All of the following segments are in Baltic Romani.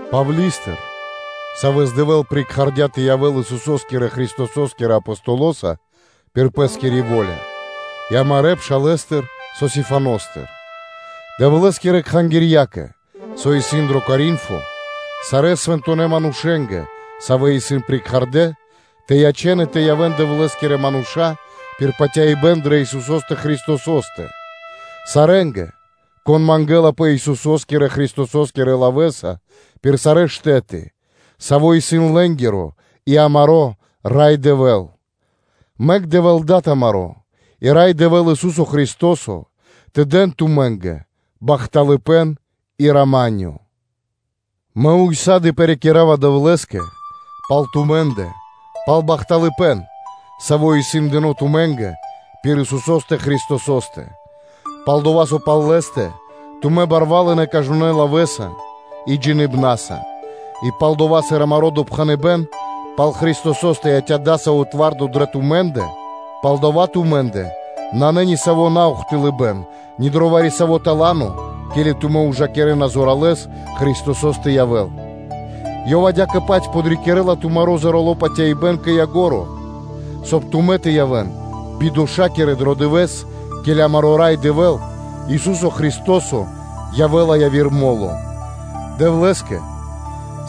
Павли́стыр, савэ́с Дэвэ́л прикхардя тэ явэ́л Исусо́скирэ Христосо́скирэ Апостолоса пир Пэ́скири во́ля, и амарэ́ пшалэстыр Сосифаностыр, Дэвлэ́скирэ кхангирьякэ, со исын дро Коринфо, сарэ́ свэнтонэ́ манушэ́нгэ, савэ́ исын прикхардэ тэ ячэн и тэ явэ́н Дэвлэ́скирэ манушэ́нца пир патяибэ́н дрэ Исусо́стэ Христосо́стэ; сарэ́нгэ, кон мангэлапэ Исусо́скирэ Христосо́скирэ лавэ́са пир сарэ́ штэ́ты, Саво́ исын лэ́нгиро и амаро́ Рай Дэвэ́л: Мэк Дэвэ́л Дад амаро́ и Рай Дэвэ́л, Ису́со Христо́со, тэ дэн тумэ́нгэ бахталыпэ́н и рама́нё (миро). Мэ ўса́ды (сак) парикирава Дэвлэ́скэ пал тумэ́ндэ пал бахталыпэ́н, саво́ исын дыно́ тумэ́нгэ пир Исусо́стэ Христосо́стэ. Пал-дова́ со пал Лэ́стэ тумэ́ барвалынэ кажнонэ́ лавэ́са и джиныбнаса, и пал-дова́ сыр амаро́ допхэныбэ́н пал Христосо́стэ яця́ дасаво твардо дрэ тумэ́ндэ, палдава́ тумэ́ндэ нанэ ни саво́ наухтылыбэн ни дро вари-саво́ тала́но (дарованиё), ке́ли тумэ́ ужакирэ́на зоралэ́с Христосо́с тэ явэ́л, Ёв адя́кэ-паць подрикирэ́ла тумаро́ зорало́ патяибэ́н кэ ко́нцо (кэ яго́ро), соб (кай) тумэ́ тэ явэ́н бидошакирэ дро дывэ́с, ке́ли амаро́ Рай Дэвэ́л, Ису́со Христо́со, явэ́ла яви́р мо́ло. Дэвлэ́скэ,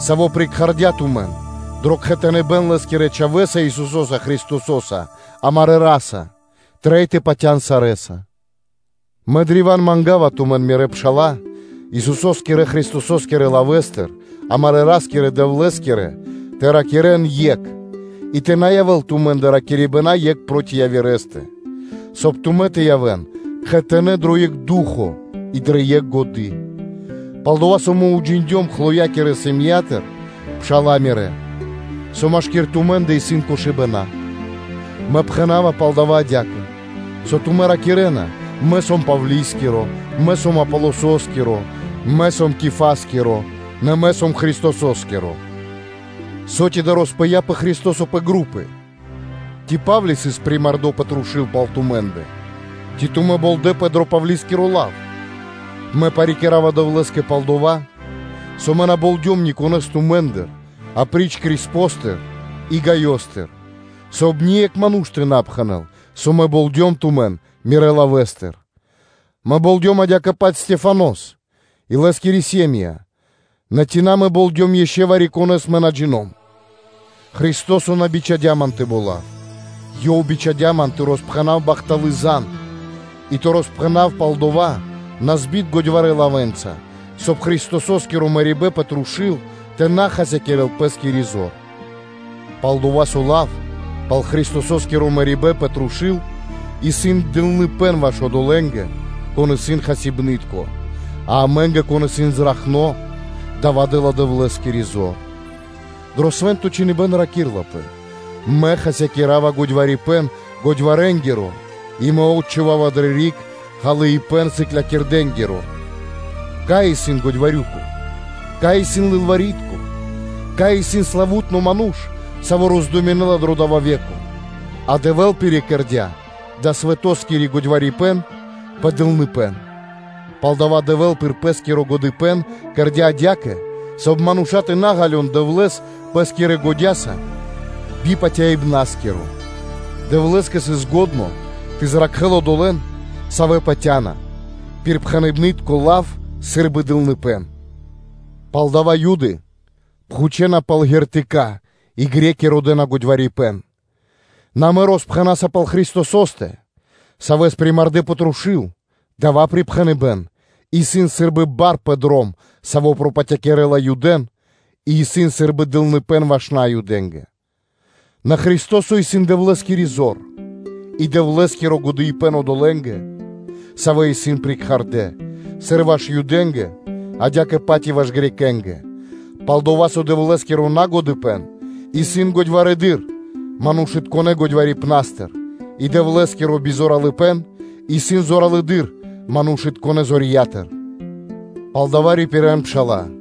Саво́ прикхардя тумэн дро кхэтаныбэн Лэ́скирэ Чхавэ́са, Исусо́са Христосо́са, Амарэ́ Ра́са, трэй тэ патя́н сарэ́са. Мэ древа́н манга́ва тумэн, мирэ́ пшала́лэ, Исусо́скирэ Христосо́скирэ лавэ́са, амарэ́ Ра́скирэ-Дэвлэ́скирэ, тэ ракирэ́н екх, и тэ на явэ́л тумэ́ндэ ракирибэна екх проти явирэ́стэ, соб (кай) тумэ́ тэ явэ́н кхэтанэ́ дро екх ду́хо (фа́но) и дрэ екх годы́. Пал-дова́ со мэ уджиндём Хлоякирэ сэм΄ятыр, пшала́лэ мирэ́, со машки́р тумэ́ндэ исын кошыбэна. Мэ пхэна́ва пал дава́ адя́кэ, со тумэ́ ракирэ́на: “Мэ сом Павли́скиро”, “мэ сом Аполососкиро”, “мэ сом Кифаскиро”, нэ “мэ сом Христосо́скиро”; со ци роспыяпэ Христо́со пэ групы? Ци Па́вли сыс примардо пэ трушу́л пал тумэ́ндэ? Ци тумэ́ болдэпэ дро Павли́скиро лав? Мэ парикирава Дэвлэ́скэ пал дова́, со мэ на болдём никонэ́с тумэ́ндыр апри́ч Криспостэ и Гайостэ, соб (кай) ние́кх ману́ш тэ на пхэнэ́л, со мэ болдём тумэн дро миро лав (мирэ́ лавэ́са). Мэ болдём адя́кэ-паць Стехванос (Стефанос) и лэ́скирэ сэ́м΄я (ири́), нэ ци мэ болдём ишчо (инкэ́) вари-конэ́с, мэ на джино́м (на джина́в). Христо́со на бичхадя́ ман тэ болав. Ёв бичхадя́ ман тэ роспхэнав бахталы́ зан (звесь), и тэ роспхэнав пал дава́ назбит годьварэ́ лавэ́нца, соб (кай) Христосо́скиро мэрибэ́н пэ трушу́л тэ на хасякирэ́л пэ́скири зор. Пал-дова́ со лав (сыклякирибэ́н) пал Христосо́скиро мэрибэ́н пэ трушу́л исын дылныпэ́н ваш одолэ́нгэ, кон исын хасибны́тко, а амэ́нгэ, кон исын зракхно, дава́ дэ́ла Дэвлэ́скири зор. Дро Свэ́нто Чхиныбэ́н ракирлапэ: “Мэ хасякира́ва годьварипэн годьварэнгиро и Мэ отчхувава дрэ риг ґалыибэ́н сыклякирдэнгиро.” Кай исын годьварюко? Кай исын лылвари́тко (кни́жнико)? Кай исын допхэныбнари (споршчыко) дро дава́ ве́ко? А Дэвэ́л пирикэрдя далэ́ свэтоскиро годьварипэн пэ дылныпэ́н. Палдава́ Дэвэ́л пир Пэ́скиро годыпэ́н кэрдя́ адя́кэ, соб (кай) мануша́ тэ на ґалён Дэвлэ́с пэ́скирэ годя́са би патяибнаскиро; Дэвлэ́скэ сыс лачхо́ тэ зракхэ́л одолэ́н, савэ́ патя́на, пир пхэныбнытко лав, саво́ исын сы́рбы дылныпэ́н. Палдава́ Юды пхучэна пал шпэ́ры (зна́ки), и Гре́ки (Баламэ́) родэ́на годьварипэн; нэ амэ роспхэна́са пал Христосо́стэ, Савэс примардэ пэ трушу́л; дава́ пхэныбэ́н исын сы́рбы бар пэ дром, саво́ пропатякирэла Юдэ́н и исын сы́рбы дылныпэ́н ваш Наюдэ́нгэ, нэ Христо́со исын Дэвлэ́скири зор и Дэвлэ́скиро годыпэ́н одолэ́нгэ, савэ́ исын прикхардэ: сыр ваш Юдэ́нгэ, адя́кэ-паць и ваш Грекэ́нгэ (Баламэ́нгэ). Пал-дова́ со Дэвлэ́скиро нагодыпэн исын годьварэдыр манушытконэ́ годьварипнастыр и Дэвлэ́скиро назоралыпэн исын зоралэды́р манушытконэ́ зоралыпнастыр. Палдава́ рипирэ́н, пшала́лэ,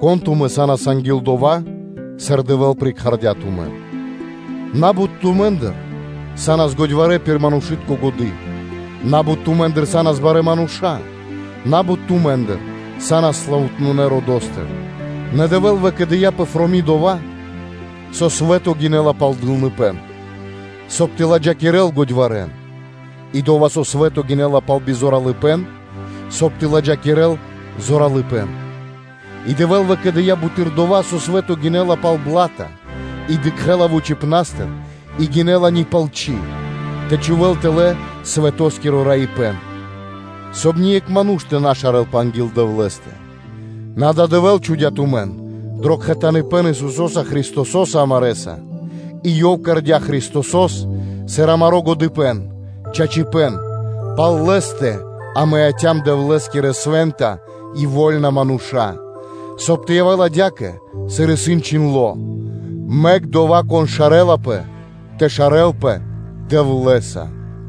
кон тумэ́ са́нас анги́л дова́, сыр Дэвэ́л прикхардя тумэн: на́бут тумэ́ндыр са́нас годьварэ́ пир манушы́тко годы́, на́бут тумэ́ндыр са́нас барэ́ мануша́, на́бут тумэ́ндыр са́нас славутнонэ родо́стыр; нэ Дэвэ́л выкэдыя́ пэфроми дова́, со свэ́то гинэ́ла пал дылныпэ́н, соб (кай) тэ ладжакирэл годьварэн, и дова́, со свэ́то гинэ́ла пал назоралыпэн, соб (кай) тэ ладжакирэл зоралыпэ́н, и Дэвэ́л выкэдыя́ буты́р дова́, со свэ́то гинэ́ла пал наджиндлыпэн и дыкхэ́ла вучипна́стыр и гинэ́ла ни палсо́, тэ чхувэ́л тэлэ́ свэтоскиро раипэн, соб (кай) ние́кх ману́ш тэ на шарэлпэ анги́л Дэвлэ́стэ. Нэ адава́ Дэвэ́л чхудя́ тумэн дро кхэтаныпэн Исусо́са Христосо́са амарэса и Ёв кэрдя́ Христосо́с сыр амаро́ годыпэ́н, чачипэ́н; пал Лэ́стэ амэ яця́м Дэвлэ́скирэ свэнтонэ́ и вольнонэ манушэ́нца, соб (кай) тэ явэ́л адя́кэ, сыр исын чхиндло́: “Мэк одова́, кон шарэлапэ, тэ шарэлпэ Дэвлэ́са.”